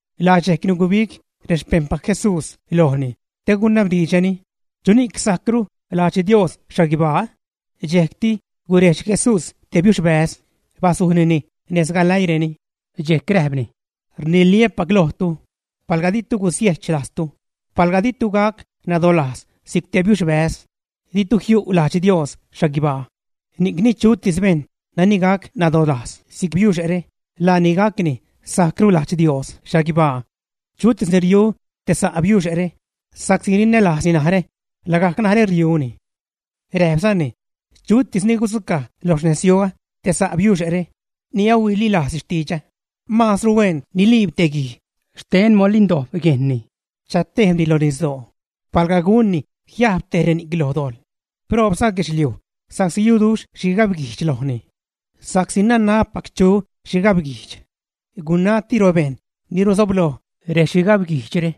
Laa dxejcni gubig rexpejṉpac Jesús lojni te gunabdiidxreni: ―¿Chuni'c sajcru lajdx Dios xhaguibaa? Dxejcti gurejdx Jesús te biuxbäz, bazujnini nez galäiireni, dxejc räjpni: ―Rniliä́pac lojtu, palga ditu gusiechlajztu, palga ditu gac nadolajz si'c te biuxbäz, ditu jiu' lajdx Dios xhaguibaa. Ni'cni chutis bejṉ nani gac nadolajz si'c biuxe're, laani gac ni sajcru lajdx Dios xhaguibaa. Chutis ni riu te sa' biuxe're, sa'csi rinälajzni narä, lagajc narä riuni. Räjpzani: ―Chutis ni gudzucaj lo xnezyuä te sa' biuxe're ni ahuililajzni xtidxä, maazru huen niliib te guij xten molin dojb yejnni, chatejbni loj nisdoo, palga gunni jiajb tej reni'c lo dojḻ. Proobza guedxliuj sa'csi yuduxh xhigabguijdx lojni. Sa'csi nanabpac chu xhigabguijdx. Gunatiro, bejṉ ni ruzobloj rexhigabguijdxre,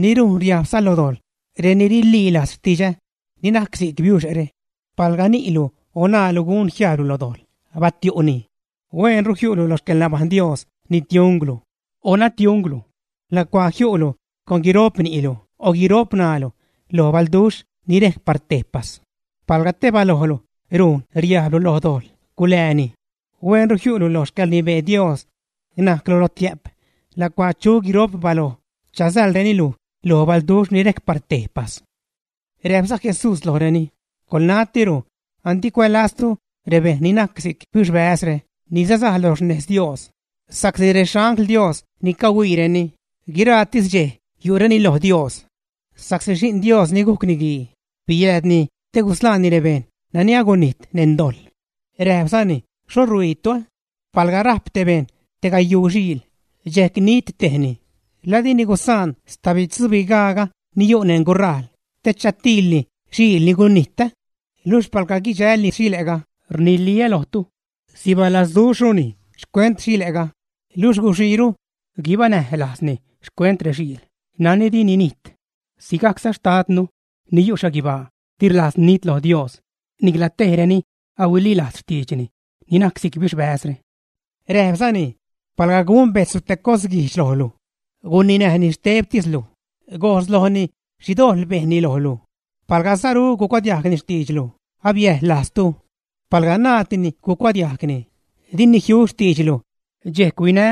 ni rujn riajbza lo dojḻ reni rililajz xtidxä, ni najc si'c biuxe're. ’Palga ni'lu o ṉaalu gun jiajblu lo dojḻ, batiu'ni. Hueenru jiu'lu lo xcäḻnabajṉ Dios nitiujnglu o ṉatiujnglu lacuaa jiilu con guiro'p ni'lu o guiro'p ṉaalu lo balduxh ni rejc par tejpas. Palga te balojlu rujn riajblu lo dojḻ, gulääni. Hueenru jiu'lu lo xcäḻrnibee Dios najclu lotiä'p lacuaa chu guiro'p baloj chazäḻreni luj lo balduxh ni rejc par tejpas. Räjpza Jesús lojreni: ―Coḻnatiro, andi cuälaztu rebejṉ ni najc si'c biuxbäzre ni sasaj lo xnez Dios, sa'csi rexangl Dios ni cahuiireni, guiraatis dxej yu'reni loj Dios. Sa'csi Xi'n Dios ni gujc Niguii biääd te gusḻaani rebejṉ nani agunijt neṉ dojḻ. Räjpzani: ―¿Xho rhuiitu? Palga rajp te bejṉ te gayuu xiil, dxejc nit tejni, ¿laa dini gusaan stabitzubigaaga ni yu' neṉ gurajl te chatiilni xile' ni gunijt, ä? Luxh palga guidxälni xile'ga, rniliä lojtu, sibalazduxhruni xcuent xile'ga luxh guxiiru guibanäj lajzni xcuent rexiil nani di ninijt. Sigajcza Xtadnu ni yu' xhaguibaa di rlajz nit lo Dios nicla tej reni ahuililajz xtiidxni, ni najc si'c biuxbäzre. Räjpzani: ―Palga gun bejtzlu te cosguijdx lojlu, guninäjni xtebtislu, gojs lojni xhi dojḻ bejnni lojlu. Palga saru gucuadiajgni xtiidxlu, abiäjḻ lajztu. Palga naaddini gucuadiajgni, dini jiu xtiidxlu, dxejc huinä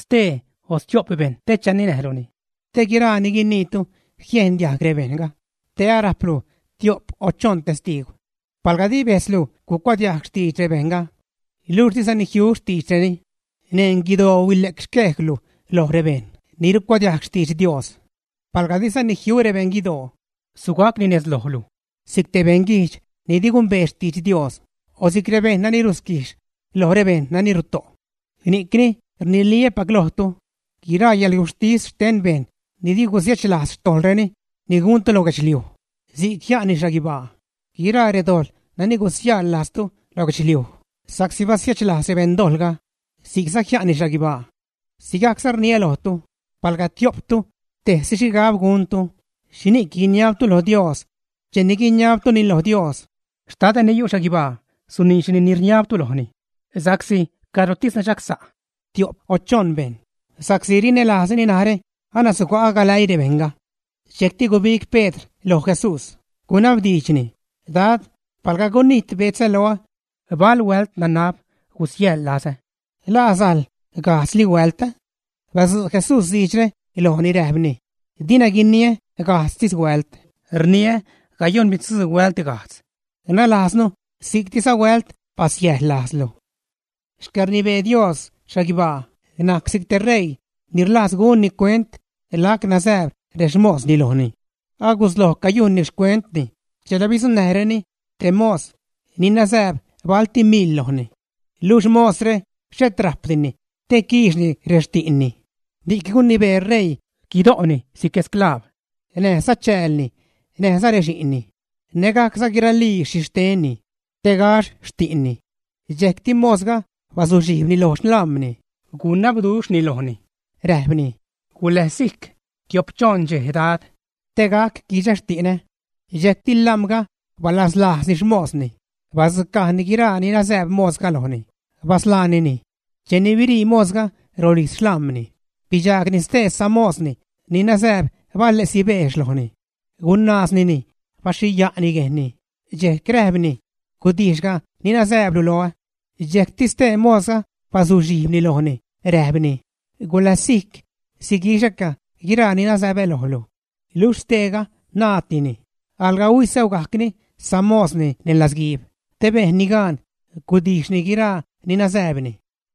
stee o stio'p bejṉ chaninäjluni, te guiraa ni guiniitu jiejn diajg rebejṉga, te arajplu tio'p o choṉ testiigw. Palga di bejtzlu gucuadiajg xtidx rebejṉga, luxh dizani jiu xtiidxreni, neṉ guidoo huile'c xquejlu loj rebejṉ ni ricuadiajg xtidx Dios. Palga dizani jiu rebeṉ guidoo, sugacni nez lojlu si'c te beṉguijdx ni di gumbee xtidx Dios o si'c rebejṉ nani rusquijx loj rebejṉ nani ruto'. ’Ni'cni rniliä́pac lojtu, guiraa yäḻguxhtis xten bejṉ ni di gusiechlajz xtojḻreni ni guntu lo guedxliuj, si'c jia'nni xhaguibaa; guiraa redojḻ nani gusiäjḻ lajztu lo guedxliuj sa'csi basiechlajz beṉdojḻga, si'cza jia'nni xhaguibaa. ’Sigajcza rniä lojtu, palga tio'ptu tejsi xhigab guntu xhini'c guiniabtu lo Dios, che guiniabtuni lo Dios, Xtadä ni yu' xhaguibaa suniidxni ni rniabtu lojni. Sa'csi cadrotis nadxagsa' tio'p o choṉ bejṉ sa'csi rinälajzreni narä, anasuga'ä galäii rebejṉga. Dxejcti gubig Pedr loj Jesús, gunabdiidxni: ―Dad, ¿palga gunijt betzä loä, bal huält nanab gusiäjḻ lazä? ¿La sajl gajdzli huält, ä? Badzu' Jesús diidxre lojni räjpni: ―Dina guiniä gajdztis huält, rniä gayoṉbidzuu huält, nalajznu si'ctiza huält basiäjḻ lajzlu. ’Xcäḻrnibee Dios xhaguibaa najc si'c te ṟeii ni rlajz gunni cuent lac nazääb rexmosni lojni. Agusloj cayujnni xcuentni chela bidzuṉnäjreni te mos ni nazääb balti mil lojni. Luxh mosre xhet rajpdini te quiixni rexti'nni, ni'c gunibee ṟeii guido'ni si'c sclav, näjza chäälni, näjza rexi'nni, nägajcza guiralii xhixtenni, te gaxh xti'nni. Dxejcti mosga bazuxhijbni loj xlam̲ni, gunabduxhni lojni, räjpni: “Guläzsijc tiop-choṉ dxej, Dad, te gac quixä xti'nä.” Dxejcti lam̲ga balazlajzni xmosni, badzucajni guiraa ni nazääb mosga lojni, basḻaanini. Cheni birii mosga rolijz xlam̲ni, bidxaagni stee samosni ni nazääb bale'si beex lojni. Gunaaznini, baxhiya'ni yejnni, dxejc räjpni: “Gudijxga ni nazääblu loä.” Dxejcti ste mosga bazuxhijbni lojni, räjpni: “Guläzsijc. Siguixäca guiraa ni nazäbä lojlu.” Luxh steega naaddini, alga huisäugacni samosni neṉ latzguiib te bejnni gaan gudijxni guiraa ni nazääbni.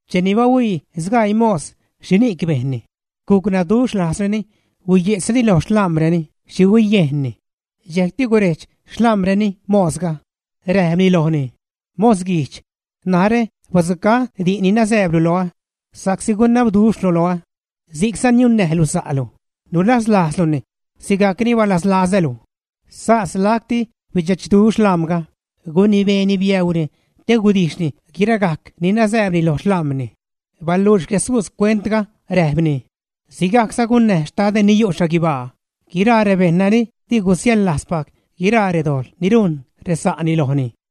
Cheni bahuii sgaii mos xhini'c bejnni, gucnaduxhlajzreni, huiye'tzreni lo xlam̲reni xhi huiyejnni. Dxejcti gurejdx xlam̲reni mosga, räjpni lojni: “¡Mos guijdx! Narä badzucaä di'n ni nazääblu loä, sa'csi gunabduxhlu loä. Si'cza niunnäjlu sa'lu, nulazlajzluni sigajc ni balazlazälu.” Sas lacti bidxechduxh lam̲ga, gunibeeni biäuuni te gudijxni guiragajc ni nazääbni lo xlam̲ni. Baluux Jesús cuentga, räjpni: ―Sigajcza gunnäj Xtadä ni yu' xhaguibaa guiraa rebejṉ ni di gusiäḻlajzpac guiraa redojḻ ni rujn resa'ni lojni.